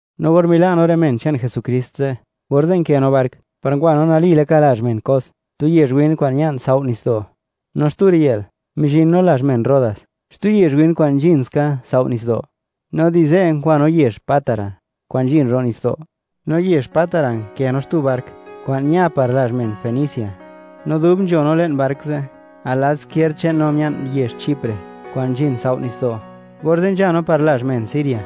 No or mila' no rë men che'n Jesukrist ze', orze' nkë no bark, par ngwa no nali laka lazh men Cos, tu yezh win kwa'n nzhin tsao' nitsdo'. No xtu riyë'l, mizhin no lazh men Rodas, xtu yezh win kwa'n nzhin ska tsao' nitsdo'. No di ze' ngwa no yezh Pátara, kwa'n nzhin ro' nitsdo'. No yezh Pátara nkë no xtu bark, kwa'n ña par lazh men Fenicia. No dub nzho no le'n bark ze', al lad izkierd che'n no mia'n yezh Chipre, kwa'n nzhin tsao' nitsdo'; orze' nzha no par lazh men Siria.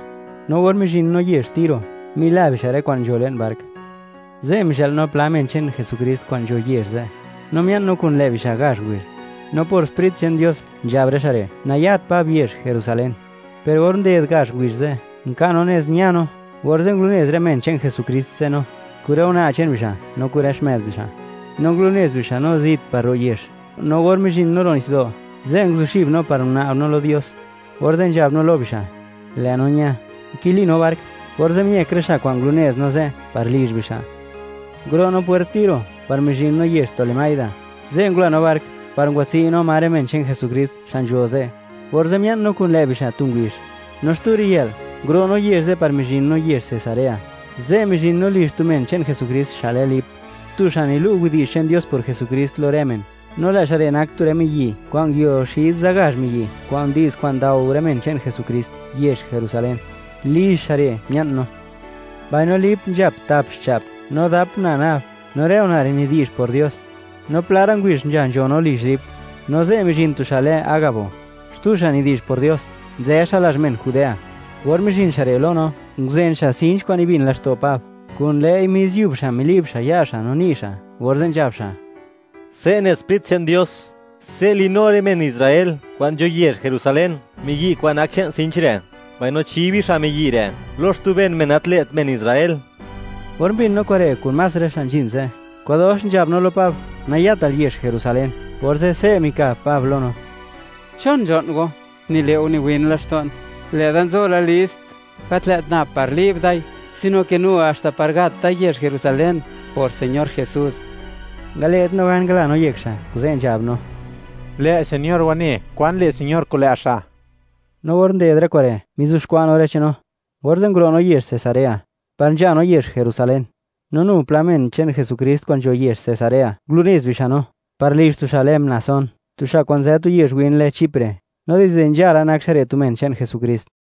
No or mizhin no yezh Tiro, mila bixa' rë kwa'n nzho le'n bark. Ze', mizhë'l no pla men che'n Jesukrist kwa'n nzho yezh ze', no mia'n no kun lë' bixa' gazh ngubizh. No por Sprit che'n Dios, nzhab rë xa' re', nayat Pab yezh Jerusalén. Per or nded gazh ngubizh ze', nka' no nez ña no, orze' ngulunez rë men che'n Jesukrist ze' no, kun rë una' che'n bixa' no kun rë xmë'd bixa'. No ngulunez bixa' no zit par ro' yezh. No or mizhin no ro' nitsdo', ze' nguzuxib no, par guna'b no lo Dios. Orze' nzhab no lo bixa': “Lë' no ña”, nkili no bark, orze' miëk rë xa' kwa'n ngulunez no ze' par lizh bixa'. Nguro' no pwert Tiro, par mizhin no yezh Tolemaida, ze' ngula no bark, par ngwatsi' no ma rë men che'n Jesukrist xa' nzho ze', orze' mia'n no kun lë' bixa' tu ngubizh. No xtu riyë'l, nguro' no yezh ze' par mizhin no yezh Cesarea, ze' mizhin no lizh tu men che'n Jesukrist xa' lë Lip, tu xa' nilu' widi'zh che'n Dios por Jesukrist lo rë men, no lë' xa' re' nak tu rë miyi' kwa'n nguio xid za gazh miyi' kwa'n ndi'z kwa'n ndao rë men che'n Jesukrist yezh Jerusalén. Lizh xa' re' mia'n no. Mbaino Lip nzhap tap xcha'p, no dap una' nab; no rë una' re' nidi'zh por Dios. No pla ra' ngubizh nzha nzho no lizh Lip, no ze' mizhin tu xa' lë Agabo, xtu xa' nidi'zh por Dios; nzë xa' lazh men Judea. Or mizhin xa' re' lo no, nguzen xa' sinch kwa'n nibin laxto' Pab, kun lë'i mis yub xa' mili'b xa' ya' xa' no ni' xa', orze' nzhab xa': ―Se' ne Sprit che'n Dios: “Se' li'nu rë men Israel kwa'n nzho yezh Jerusalén miyi' kwa'n nak che'n sinch re', mbaino chi bixa' miyi' re' lo xtu ben men, gat lë't men Israel.” Or mbin no kure', kun más rë xa' nzhin ze', kwa'dox nzhab no lo Pab: —¡Nayatal yezh Jerusalén! Orze' se' mikab Pab lo no: ―¿Chon nzho'n go, nile' go niwin laxto'n? Lë'da nzo la list, gat lë't nab par li'b dai, sino ke nu haxta par gat da yezh Jerusalén, por Señor Jesús. Ngale't no gan, ngala yek xa', kuze' nzhab no: ―Lë' Señor wane kwan le' Señor kun lë' xa'. No or nded rë kure', mizuxkwa' no rë che'n no, orze' nguro' no yezh Cesarea, par nzha no yezh Jerusalén. No nu pla men che'n Jesukrist kwa'n nzho yezh Cesarea, ngulunez bixa' no, par lizh tu xa' lë Mnasón, tu xa' kwa'n nzë tu yezh win lë Chipre, no dizde nzhala nak xa' re' tu men che'n Jesukrist.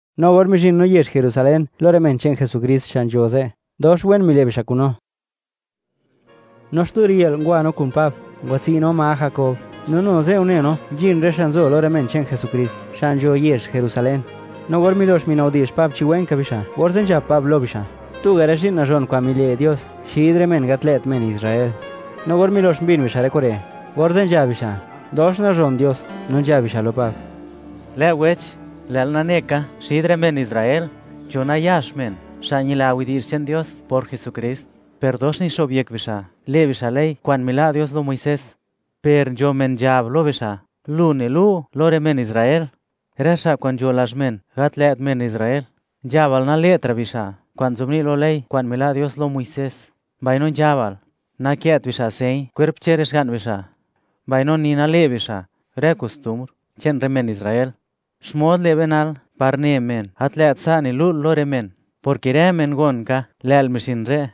No or mizhin no yezh Jerusalén lo rë men che'n Jesukrist xa' nzho ze', dox wen mile' bixa' kun no. No xtu riyë'l, ngwa no kun Pab, ngwatsi' no ma Jakob, no nu ze' une no, nzhin rë xa' nzo lo rë men che'n Jesukrist, xa' nzho yezh Jerusalén. No or milox minabdi'zh Pab chi wen ka bixa', orze' nzhab Pab lo bixa', tuga' rë zhi'n nazhon kwa'n mile' Dios xid rë men gat lë't men Israel. No or milox mbin bixa' rë kure', orze' nzhab bixa': “¡Dox nazhon Dios!”, no nzhab bixa' lo Pab: ―Lë' wech, lë'l nane ka, xid rë men Israel, nzho nayax men xa' ñila widi'zh che'n Dios por Jesukrist, per dox nguloyek bixa' le' bixa' ley kwa'n mila' Dios lo Muisés. Per nzho men nzhab lo bixa', lu nilu' lo rë men Israel, rë xa' kwa'n nzho lazh men gat lë't men Israel, nzhabal nale'tra' bixa' kwa'n nzobni' lo ley kwa'n mila' Dios lo Muisés; mbaino nzhabal nakë't bixa' señ kwerp che'n rë xga'n bixa', mbaino ni nale' bixa' rë kostumbr che'n rë men Israel. ¿Xmod le' be nal, par ne men, gat lë't sa' nilu'l lo rë men?, porke rë men gon ka, lë'l mizhin re'.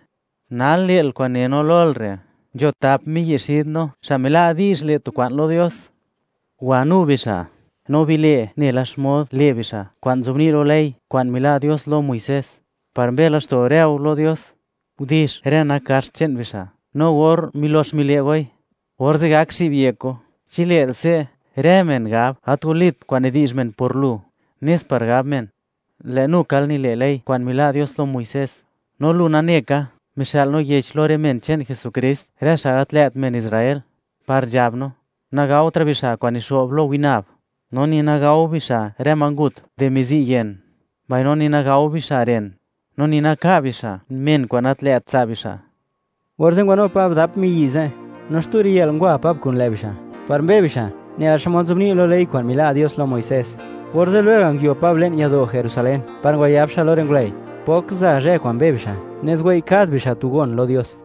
Nal le'l kwa'n ne no lol re': Nzho tap miyi' xid no, xa' mila' di'zh le' tu kwa'n lo Dios. Wanu bixa', no bile' nela xmod le' bixa' kwa'n nzobni' lo ley kwa'n mila' Dios lo Muisés, par mbe laxto' rë go lo Dios. Gudix rë nak gaxt che'n bixa', no or milox mile' goi, orze' gak zhi'b yek go. Chi le'l se', rë men gab, gat walit kwa'n nidi'zh men por lu, nes par gab men, lë' nukal nile' ley kwa'n mila' Dios lo Muisés. No lu nane ka, mixë'l no yech lo rë men che'n Jesukrist, rë xa' gat lë't men Israel, par nzhab no: Nagaotra' bixa' kwa'n nixo'b lo winab, no ni nagao bixa' rë ma ngut di mizi'yen, mbaino ni nagao bixa' ren, no ni naka' bixa' men kwa'n gat lë't tsa' bixa'. Orze' ngwanu Pab dap miyi' ze', no xtu riyë'l ngwa Pab kun lë' bixa' par mbe bixa' nela xmod nzobni' lo ley kwa'n mila' Dios lo Muisés, orze' lwega' nguio Pab le'n yado' Jerusalén, par ngwayab xa' lo rë ngulëi' pok za zhë kwa'n mbe bixa', nez wei' kad bixa' tu gon lo Dios.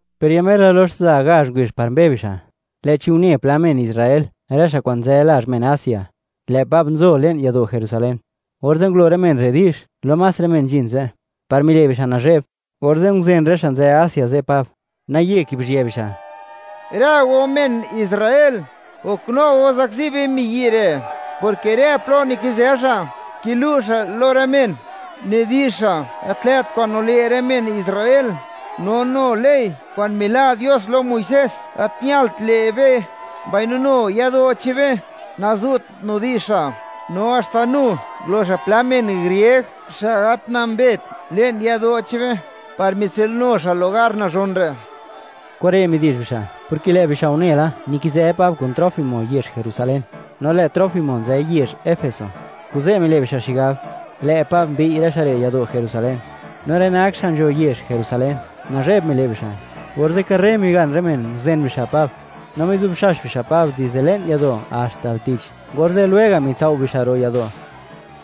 Per ya mer la lox za gazh ngubizh par mbe bixa', lë'chi une pla men Israel, rë xa' kwa'n nzë lazh men Asia, lë' Pab nzo le'n yado' Jerusalén. Orze' ngulo rë men re' di'zh lo más rë men nzhin ze', par mile' bixa' nazhe'b, orze' nguzen rë xa' nzë Asia ze' Pab, naye kibizhië bixa': ―¡Rë go men Israel, goknu go zakzi be miyi' re'!, porke rë plo nikizë xa', kilu' xa' lo rë men, nidi'zh xa' gat lë't kwa'n nile' rë men Israel, no nu ley kwa'n mila' Dios lo Muisés gat ñalt le' be, mbaino nu yado' che'n be, nazu't nidi'zh xa'. ¡No haxta nu ngulo xa' pla men grieg, xa' gat nambet, le'n yado' che'n be, par mitsinu xa' lugar nazhon re'! Kure' midi'zh bixa', porke lë' bixa' une la, nikizë Pab kun Trófimo yezh Jerusalén, no lë' Trófimo nzë yezh Efeso, kuze' mile' bixa' xigab, lë' Pab mbiy' rë xa' re' yado' Jerusalén. No rë nak xa' nzho yezh Jerusalén, nazhe'b mile' bixa', orze' karre migan rë men, nguzen bixa' Pab, no mizubxax bixa' Pab dizde le'n yado' haxta al tich, orze' lwega' mitsao' bixa' ro' yado'.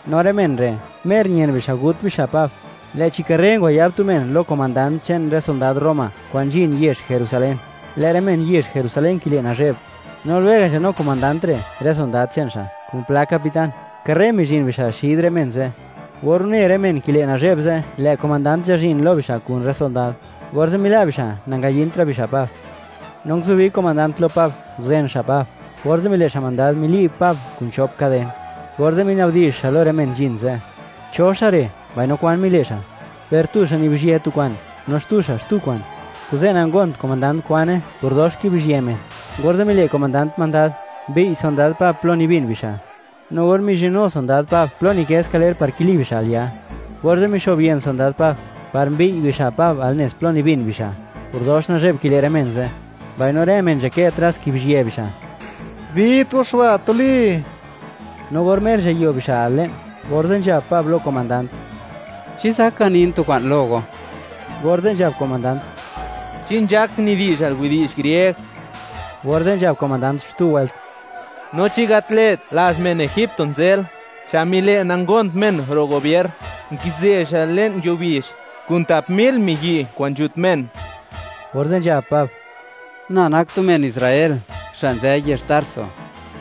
No rë men re', mer ñen bixa' gut bixa' Pab, lë'chi karre ngwayab tu men lo komandant che'n rë sondad Roma, kwa'n nzhin yezh Jerusalén, lë' rë men yezh Jerusalén kile' nazhe'b. No lwega' nzhanu komandant re' rë sondad che'n xa', kun pla capitán, karre mizhin bixa' xid rë men ze'. Or une rë men kile' nazhe'b ze' lë' komandant nzhazhin lo bixa' kun rë sondad, orze' mila' bixa' nangayintra' bixa' Pab. No nguzubi komandant lo Pab, nguzen xa' Pab, orze' mile' xa' mandad, mili'b Pab kun chop kaden, orze' minabdi'zh xa' lo rë men nzhin ze': “¿Cho xa' re', mbaino kwan mile' xa'?” Per tu xa' nibizhyë tu kwa'n, no xtu xa' xtu kwa'n, kuze' nangont komandant kwane por dox kibizhië men, orze' mile' komandant mandad, mbiy' sondad Pab plo nibin bixa'. No or mizhinnu sondad Pab plo nikë skaler par kili bixa' al ya, orze' mixo'b yën sondad Pab, par mbiy' bixa' Pab al nez plo nibin bixa', por dox nazhe'b kile' rë men ze', mbaino rë men nzadkë tras kibizhië bixa': ―¡Bit go xa' ba' tuli! No or mer nzhayo bixa' al le'n, orze' nzhab Pab lo komandant: ―¿Chi zak ganin tu kwa'n lo go? Orze' nzhab komandant: ―¿Chi nzhak nidi'zhal widi'zh grieg? Orze' nzhab komandant xtu wëlt: ―¿No chi gat lë't lazh men egipto nzël, xa' mile' nangont men ro' gubier, nkizë xa' le'n yuo bizh, kun tap mil miyi' kwa'n nzhut men? Orze' nzhab Pab: ―Na nak tu men Israel, xa' nzë yezh Tarso,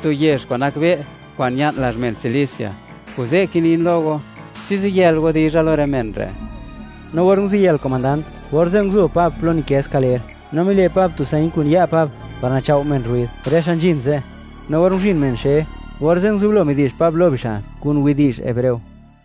tu yezh kwa'n nakbe' kwa'n ña'n lazh men Cilicia, kuze' kinin lo go, chi ziyël go dizha lo rë men re'. No or nguziyël komandant, orze' nguzo Pab plo nikë skaler, no mile' Pab tu señ kun ya' Pab, par nachao' men rruid, rë xa' nzhin ze'. No or nguzhin men xe, orze' nguzublo midi'zh Pab lo bixa' kun widi'zh hebreo: